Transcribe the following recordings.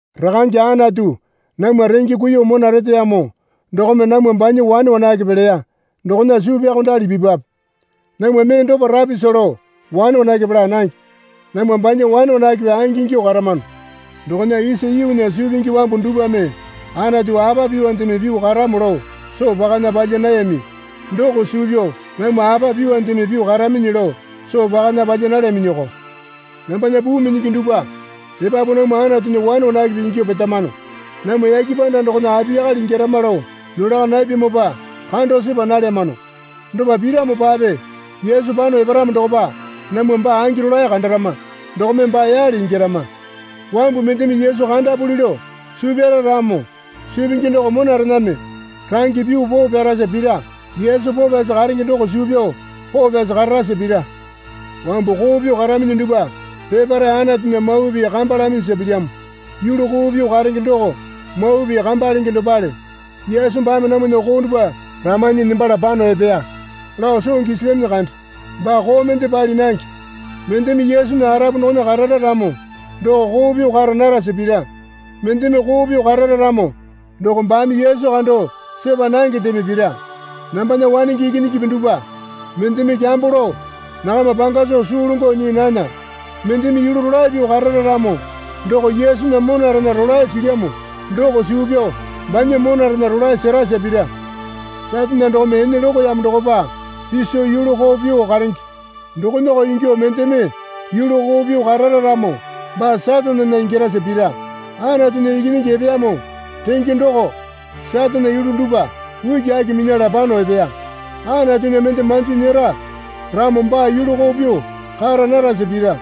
Rakange Anatu namwa renge kuiyuo mona reteyamo dokome namwa banya wane wanakepe leya dokona suu pyaokondali pipwape. Namwa mee dopa rapisa lao wane wanakepe laa nange. Namwa banya wane wanakepe angingyuo karamano. Dokona isa yuunya suu pingi wambu dupwame Anatu apa pyuondeme pyuo karamo lao soo pakana palya nayami doko suu pyao namwa apa pyuondeme pyuo karaminyi lao soo pakana palya nalyaminyiko. Nambana puu minyingi dupwa epapu namwa Anatunya wane wanakepe ingyuo petamano. Namwa yake panda dokona apiyakale ingyarama lao nolaka napyamopa kando sepa nalyamano. Dopa piramopape Yesu pano eparamo dokopa namwa baa angi rolae kandarama dokome baa yale ingyarama. Wambu mendeme Yesu kandapuli lao suu pyara ramo suu pingi doko monarename range pyuo poo pyarasa pira. Yesu poo pyasi karenge doko suu pyao poo pyasi kararasa pira. Wambu koo pyuo karaminyi dupwa peparae Anatunya mawa pii kamba laminyisa pilyamo. Yulu koo pyuo karenge doko mawa pii kamba lenge dopale. Yesu baame namwana koo dupwa ramanyi nembala pano epeya lao soo gisilyaminyi kande. Baa koo mende pali nange. Mendeme Yesunya arapu dokona karara ramo doko koo pyuo kara narasa pira. Mendeme koo pyuo karara ramo doko baame Yesu kando sepa nangendeme pira. Nambana wanenge ikinyingipi dupwa, mendeme kyambo lao nakama panga soo suu longo nyii nana. Mendeme yulu rolae pyuo karara ramo doko Yesunya monarena rolae silyamo doko suu pyao banya monarena rolae serasa pira. Satane dokome ene lokoyamo dokopa piso yulu koo pyuo karenge dokonako ingyuo mendeme yulu koo pyuo karara ramo baa Satanena ingyarasa pira. Anatunya Ikinyingi epeyamo renge doko Satanena yulu dupwa ukiaki minyala pano epeya. Anatunya mende manjo nyera ramo baa yulu koo pyuo kara narasa pira.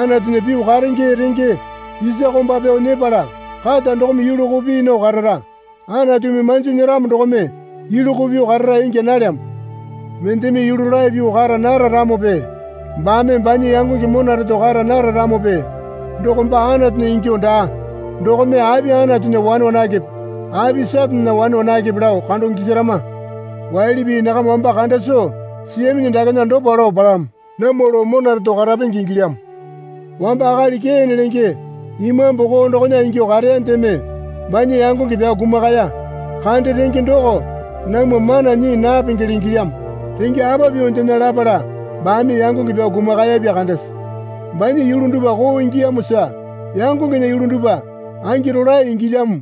Anatunya pyuo karenge renge isa komba pyao nyepala kata dokome yulu koo pii nao karara. Anatumi manjo nyeramo dokome yulu koo pyuo karara ingya nalyamo. Mendeme yulu rolae pyuo kara nara ramope baame banya yangonge mona reto kara nara ramope doko baa Anatunya ingyuo daa. Dokome api Anatunya wane wanakepe api Satanena wane wanakepe lao kando gisarama. Waili pii nakama wamba kanda soo siyaminyi dakena dopa lao palamo. Namwa lao mona reto karapenge ingilyamo. Wamba akali Kene lenge imambu koo dokona ingyuo kareyandeme banya yangonge pyao kumakaya kande renge doko namwa mana nyii napengele ingilyamo. Renge apa pyuondena lapala baame yangonge pyao kumakayapya kandese? Banya yulu dupwa koo ingiyamosa yangongena yulu dupwa angi rolae ingilyamo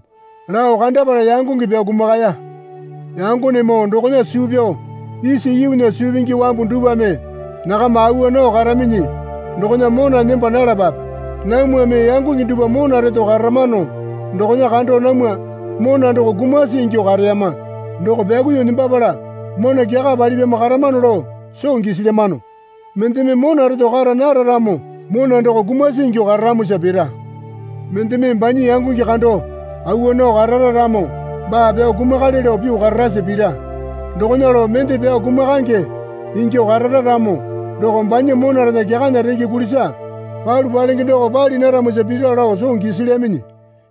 lao kandapala yangonge pyao kumakaya. Yangonemoo dokona suu pyao isa yuunya suu pingi wambu dupwame nakama awa nao karaminyi dokona mona nemba nalapape. Namwame yangonge dupwa mona reto karamano dokona kando namwa mona doko kumasi ingyuo kareyama doko pyakuiyuo nembapala mona kyaka palipyamo karamano lao soo gisilyamano. Mendeme mona reto kara nara ramo doko mona doko kumasi ingyuo kararamosa pira. Mendeme banya yangonge kando awa nao karara ramo baa pyao kumakale lao pyuo kararasa pira. Dokona lao mende pyao kumakaenge ingyuo karara ramo doko banya monarena kyakana renge kulisa palu palenge doko pali naramosa pira lao soo gisilyaminyi.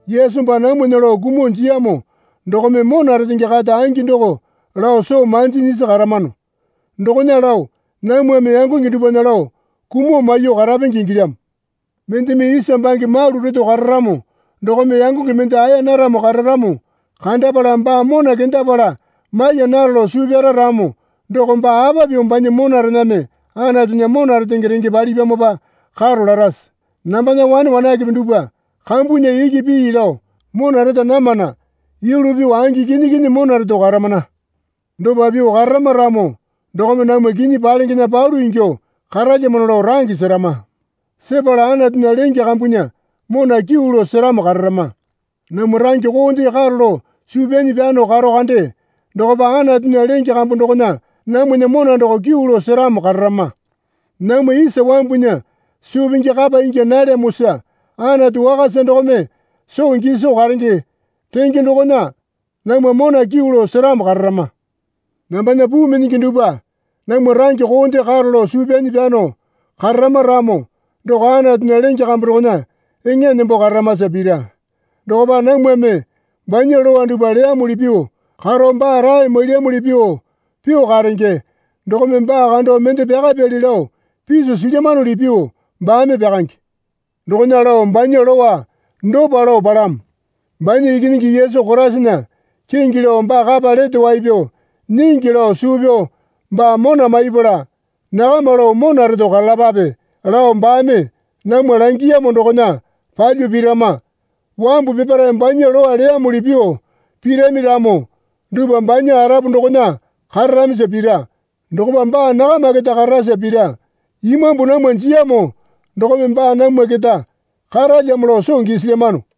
Yesu baa namwana lao kumuo jiyamo dokome mona retenge kata angi doko lao soo manji nyisi karamano. Dokona lao namwame yangonge dupwana lao kumuo maiyuo karapenge ingilyamo. Mendeme isa bange malu reto kararamo dokome yangonge mende aeya naramo kararamo kandapala baa mona kendapala maiya naro lao suu pyara ramo doko baa apa pyuo banya monarename Anatunya mona retenge renge palipyamopa karo larase? Nambana wane wanakepe dupwa kambunya iki pii lao mona reta namana. Yulu pyuo angi kinyi kinyi mona reto karamana. Dopa pyuo kararama ramo dokome namwa kinyi palengena palyuo ingyuo karalyamano lao range serama. Sepala Anatunya lenge kambunya mona kyuu lao seramo kararama. Namwa range koonde karo lao suu pyanyi pyano karo kande dokopa Anatunya lenge kambu dokona namwana mona doko kyuu lao seramo kararama. Namwa isa wambunya suu pingi kapa ingya nalyamosa Anatu wakasa dokome soo giso karenge renge dokona namwa mona kyuu lao seramo kararama. Nambana puu minyingi dupwa namwa range koonde karo lao suu pyanyi pyano kararama ramo doko Anatunya lenge kambu dokona eŋa nembo kararamasa pira. Dokopa namwame banya lowa dupwa leyamuli pyuo karo baa rae mailyamuli pyuo pyuo karenge dokome baa kando mende pyakapyali lao piso silyamanuli pyuo baame pyakange. Dokona lao banya lowa dopa lao palamo. Banya Ikinyingi Yesu Koraisana kingi lao baa kapa lete wai pyao nyingi lao suu pyao baa mona maipala nakama lao mona reto karalapape lao baame namwa langiyamo dokona palyuo pirama. Wambu peparae banya lowa leyamuli pyuo pirami ramo dupwa banya arapu dokona kararamisa pira. Dokopa baa nakama keta kararasa pira. Imambu namwa jiyamo dokome baa namwa keta karalyamo lao soo gisilyamano.